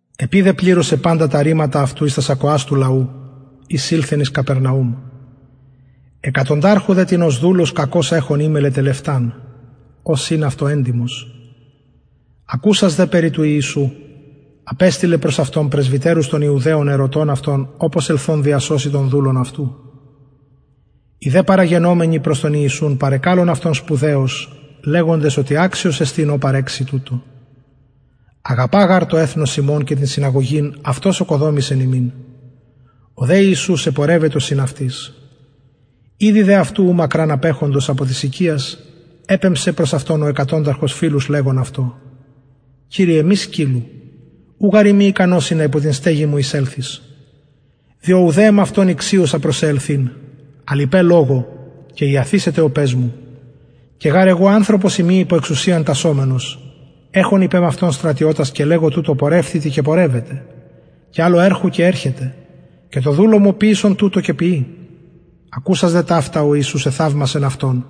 επει δε επληρωσεν παντα τα ρηματα αυτου εις τας ακοας του λαου εισηλθεν εις καπερναουμ εκατονταρχου δε τινος δουλος κακως εχων εμελλεν τελευταν ος ην αυτω εντιμος ακουσας δε περι του ιησου απεστειλεν προς αυτον πρεσβυτερους των ιουδαιων ερωτων αυτον οπως ελθων διασωση τον δουλον αυτου οι δε παραγενομενοι προς τον ιησουν παρεκαλουν αυτον σπουδαιως λεγοντες οτι αξιος εστιν ω παρεξει τουτο αγαπα γαρ το εθνος ημων και την συναγωγην αυτος ωκοδομησεν ημιν ο δε ιησους επορευετο συν αυτοις ηδη δε αυτου ου μακραν απεχοντος απο της οικιας επεμψεν προς αυτον ο εκατονταρχος φιλους λεγων αυτω κυριε μη σκυλλου ου γαρ ειμι ικανος ινα υπο την στεγην μου εισελθης διο ουδε εμαυτον ηξιωσα προς σε ελθειν αλλ ειπε λογω και ιαθησεται ο παις μου και γαρ εγω ανθρωπος ειμι υπο εξουσιαν τασσομενος εχων υπ εμαυτον στρατιωτας και λεγω τουτω πορευθητι και πορευεται και αλλω ερχου και ερχεται και τω δουλω μου ποιησον τουτο και ποιει ακουσας δε ταυτα ο ιησους εθαυμασεν αυτον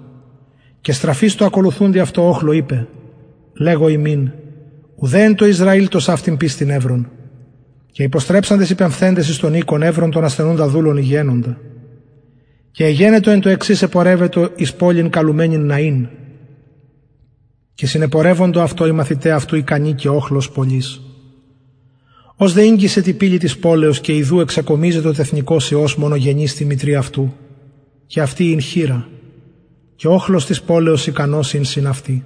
και στραφεις τω ακολουθουντι αυτω οχλω ειπεν λεγω υμιν ουτε εν τω ισραηλ τοσαυτην πιστιν ευρον και υποστρεψαντες οι πεμφθεντες εις τον οικον ευρον τον ασθενουντα δουλον υγιαινοντα και εγενετο εν τω εξης επορευετο εις πολιν καλουμενην ναιν και συνεπορευοντο αυτω οι μαθηται αυτου ικανοι και οχλος πολυς ως δε ηγγισεν τη πυλη της πολεως και ιδου εξεκομιζετο τεθνηκως υιος μονογενης τη μητρι αυτου και αυτη χηρα και οχλος της πολεως ικανος συν αυτη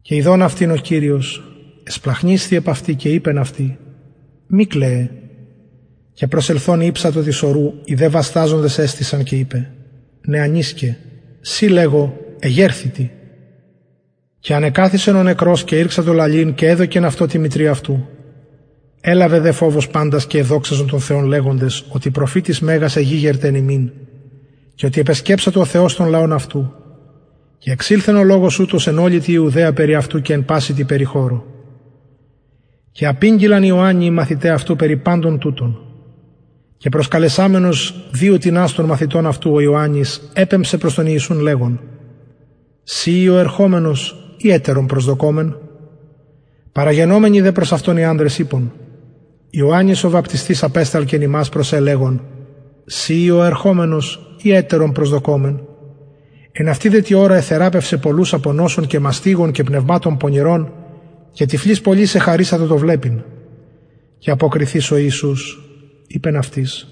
και ιδων αυτην ο κυριος εσπλαγχνισθη επ αυτη και ειπεν αυτη μη κλαιε και προσελθων ηψατο της σορου οι δε βασταζοντες εστησαν και ειπεν νεανισκε σοι λεγω εγερθητι και ανεκαθισεν ο νεκρος και ηρξατο λαλειν και εδωκεν αυτον τη μητρι αυτου ελαβεν δε φοβος παντας και εδοξαζον τον θεον λεγοντες οτι προφητης μεγας εγηγερται εν ημιν και οτι επεσκεψατο ο θεος τον λαον αυτου και εξηλθεν ο λογος ουτος εν ολη τη ιουδαια περι αυτου και εν παση τη περιχωρω και απηγγειλαν ιωαννη οι μαθηται αυτου περι παντων τουτων και προσκαλεσαμενος δυο τινας των μαθητων αυτου ο ιωαννης επεμψεν προς τον ιησουν λεγων συ ει ο ερχομενος η αλλον προσδοκωμεν παραγενομενοι δε προς αυτον οι ανδρες ειπον ιωαννης ο βαπτιστης απεσταλκεν ημας προς σε λεγων συ ει ο ερχομενος η αλλον προσδοκωμεν εν αυτη δε τη ωρα εθεραπευσεν πολλους απο νοσων και μαστιγων και πνευματων πονηρων και τυφλοις πολλοις εχαρισατο το βλεπειν και αποκριθεις ο ιησους ειπεν αυτοις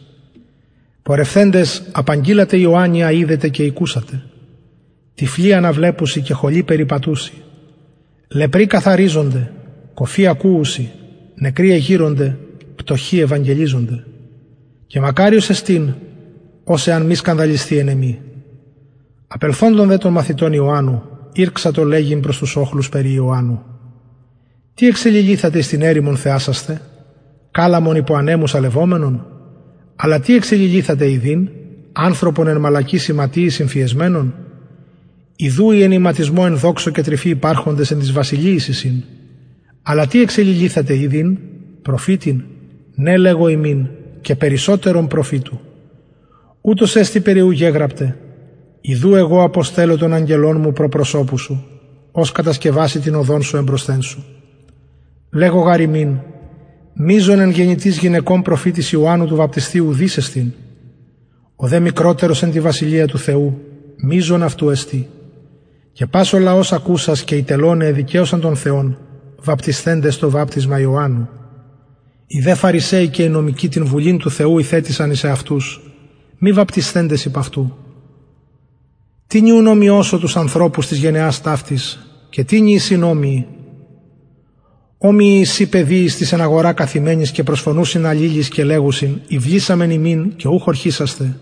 πορευθεντες απαγγειλατε ιωαννη α ειδετε και ηκουσατε οτι τυφλοι αναβλεπουσιν χωλοι περιπατουσιν λεπροι καθαριζονται κωφοι ακουουσιν νεκροι εγειρονται πτωχοι ευαγγελιζονται και μακαριος εστιν ος εαν μη σκανδαλισθη εν εμοι απελθοντων δε των αγγελων ιωαννου ηρξατο λεγειν τοις οχλοις περι ιωαννου τι εξεληλυθατε εις την ερημον θεασασθαι καλαμον υπο ανεμου σαλευομενον αλλα τι εξεληλυθατε ιδειν ανθρωπον εν μαλακοις ιματιοις ημφιεσμενον ιδου οι εν ιματισμω ενδοξω και τρυφη υπαρχοντες εν τοις βασιλειοις εισιν αλλα τι εξεληλυθατε ιδειν προφητην ναι λεγω υμιν και περισσοτερον προφητου ουτος εστιν περι ου γεγραπται ιδου εγω αποστελλω τον αγγελον μου προ προσωπου σου ος κατασκευασει την οδον σου εμπροσθεν σου λεγω γαρ υμιν μειζων εν γεννητοις γυναικων προφητης ιωαννου του βαπτιστου ουδεις εστιν ο δε μικροτερος εν τη βασιλεια του θεου μειζων αυτου εστιν και πας ο λαος ακουσας και οι τελωναι εδικαιωσαν τον θεον βαπτισθεντες το βαπτισμα ιωαννου οι δε φαρισαιοι και οι νομικοι την βουλην του θεου ηθετησαν εις εαυτους μη βαπτισθεντες υπ αυτου τινι ουν ομοιωσω τους ανθρωπους της γενεας ταυτης και τινι εισιν ομοιοι ομοιοι εισιν παιδιοις τοις εν αγορα καθημενοις και προσφωνουσιν αλληλοις και λεγουσιν ηυλησαμεν υμιν και ουκ ωρχησασθε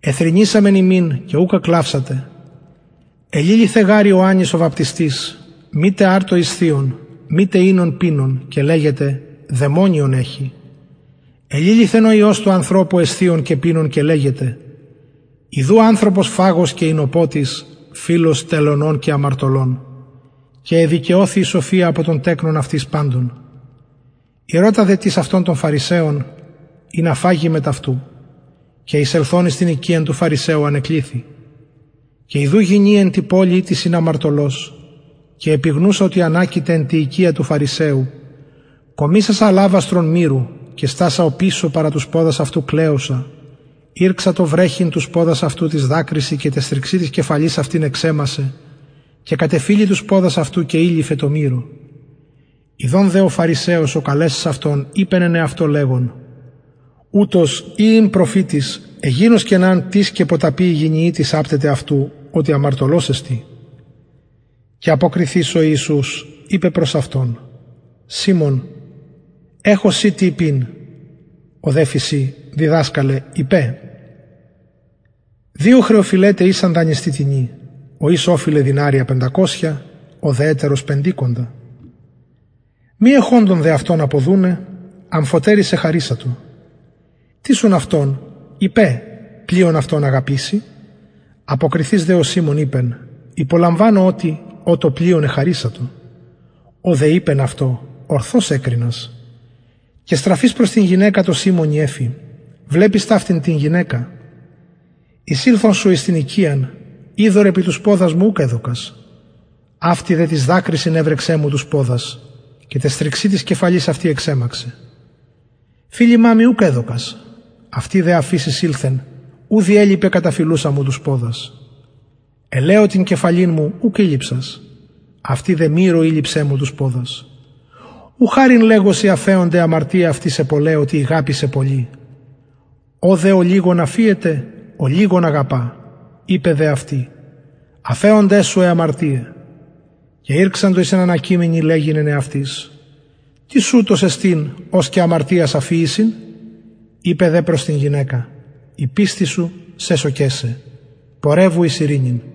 εθρηνησαμεν υμιν και ουκ εκλαυσατε εληλυθεν γαρ ιωαννης ο βαπτιστης μητε αρτον εσθιων μητε οινον πινων και λεγετε δαιμονιον εχει εληλυθεν ο υιος του ανθρωπου εσθιων και πινων και λεγετε ιδου ανθρωπος φαγος και οινοποτης φιλος τελωνων και αμαρτωλων και εδικαιωθη η σοφια απο των τεκνων αυτης παντων ηρωτα δε τις αυτον των φαρισαιων ινα φαγη μετ αυτου και εισελθων εις την οικιαν του φαρισαιου ανεκλιθη και ιδου γυνη εν τη πολει ητις ην αμαρτωλος επιγνουσα οτι ανακειται εν τη οικια του φαρισαιου κομισασα αλαβαστρον μυρου και στασα παρα τους ποδας αυτου οπισω κλαιουσα ηρξατο βρεχειν τους ποδας αυτου τοις δακρυσιν και ταις θριξιν της κεφαλης αυτης εξεμασσεν και κατεφιλει τους ποδας αυτου και ηλειφεν τω μυρω ιδων δε ο φαρισαιος ο καλεσας αυτον ειπεν εν εαυτω λεγων ουτος ει ην προφητης εγινωσκεν αν τις και ποταπη η γυνη ητις απτεται αυτου οτι αμαρτωλος εστιν και αποκριθεις ο ιησους ειπεν προς αυτον σιμων εχω σοι τι ειπειν ο δε φησιν διδασκαλε ειπε δυο χρεωφειλεται ησαν δανειστη τινι ο εις ωφειλεν δηναρια πεντακοσια ο δε ετερος πεντηκοντα μη εχοντων δε αυτων αποδουναι αμφοτεροις εχαρισατο τις ουν αυτων ειπε πλειον αυτον αγαπησει αποκριθεις δε ο σιμων ειπεν υπολαμβανω οτι ω το πλειον εχαρισατο ο δε ειπεν αυτω ορθως εκρινας και στραφεις προς την γυναικα τω σιμωνι εφη βλεπεις ταυτην την γυναικα εισηλθον σου εις την οικιαν υδωρ επι τους ποδας μου ουκ εδωκας αυτη δε τοις δακρυσιν εβρεξεν μου τους ποδας και ταις θριξιν της κεφαλης αυτης εξεμαξεν φιλημα μοι ουκ εδωκας αυτη δε αφ ης εισηλθον ου διελιπεν καταφιλουσα μου τους ποδας ελαιω την κεφαλην μου ουκ ηλειψας αυτη δε μυρω ηλειψεν μου τους ποδας ου χαριν λεγω σοι αφεωνται αι αμαρτιαι αυτης αι πολλαι οτι ηγαπησεν πολυ ω δε ολιγον αφιεται ολιγον αγαπα ειπεν δε αυτη αφεωνται σου αι αμαρτιαι και ηρξαντο οι συνανακειμενοι λεγειν εν εαυτοις τις ουτος εστιν ος και αμαρτιας αφιησιν ειπεν δε προς την γυναικα η πιστις σου σεσωκεν σε πορευου εις ειρηνην